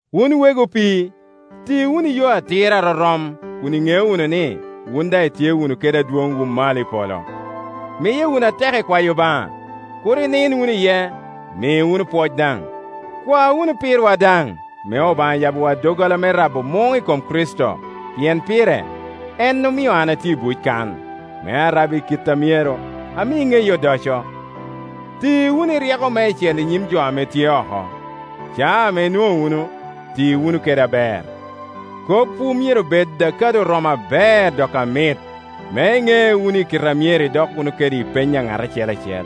Wun wegi opii, ti wunu i yo atir a rorom, kun iŋeo wunu ni, wun daŋ itye wunu kede adwoŋwu malo i polo. Miye wunu atek i kwayo Obaŋa, kur inin wunu iye; mi wunu pwoc daŋ. Kwa wunu pirwa daŋ, me Obaŋa yabbiwa doggola me rabo muŋ i kom Kricito, pien pire, en omio an atye i buc kan, me arab i kit a myero, ami ŋeye odoco. Ti wunu i ryeko meicel i nyim jo ame tye oko; caa ame inwoŋo wunu, ti wunu kede aber. Kopwu myero bed ame kado oromo aber dok amit, me iŋe wunu kite a myero idok wunu kede i peny a ŋat acel acel.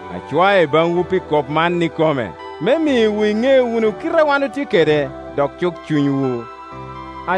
Acwae baŋwu pi kop man ikome, me miwu iŋe wunu kite ame wan otye kede, dok cuk cunywu. #Pile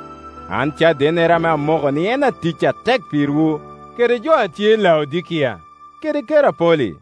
An cadennere ame amoko ni en atic atek pirwu kede jo a tye Laodikia kede Kerapoli.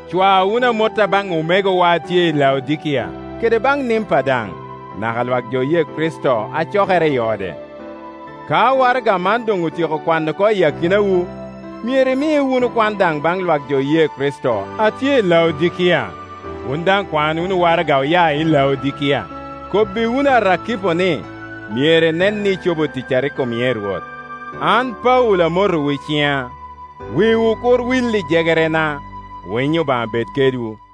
Cwa wunu amotta baŋ omegowa a tye i Laodikia kede baŋ Nimpa daŋ, naka lwak jo oye Kricito a cokere i ode. Ka waraga man doŋ otyeko kwano oko i akinawu, myero imi wunu kwan daŋ baŋ lwak jo oye Kricito a tye i Laodikia; wun daŋ kwan wunu waraga oya i Laodikia. #Pile 2Kobbi wunu Arakipo ni, myero enen ni ecobo tic a rik omie i Rwot. An Paulo amotowu i ciŋa. Wiwu kur wil i jegerena. Winyo Obaŋa bed kedwu.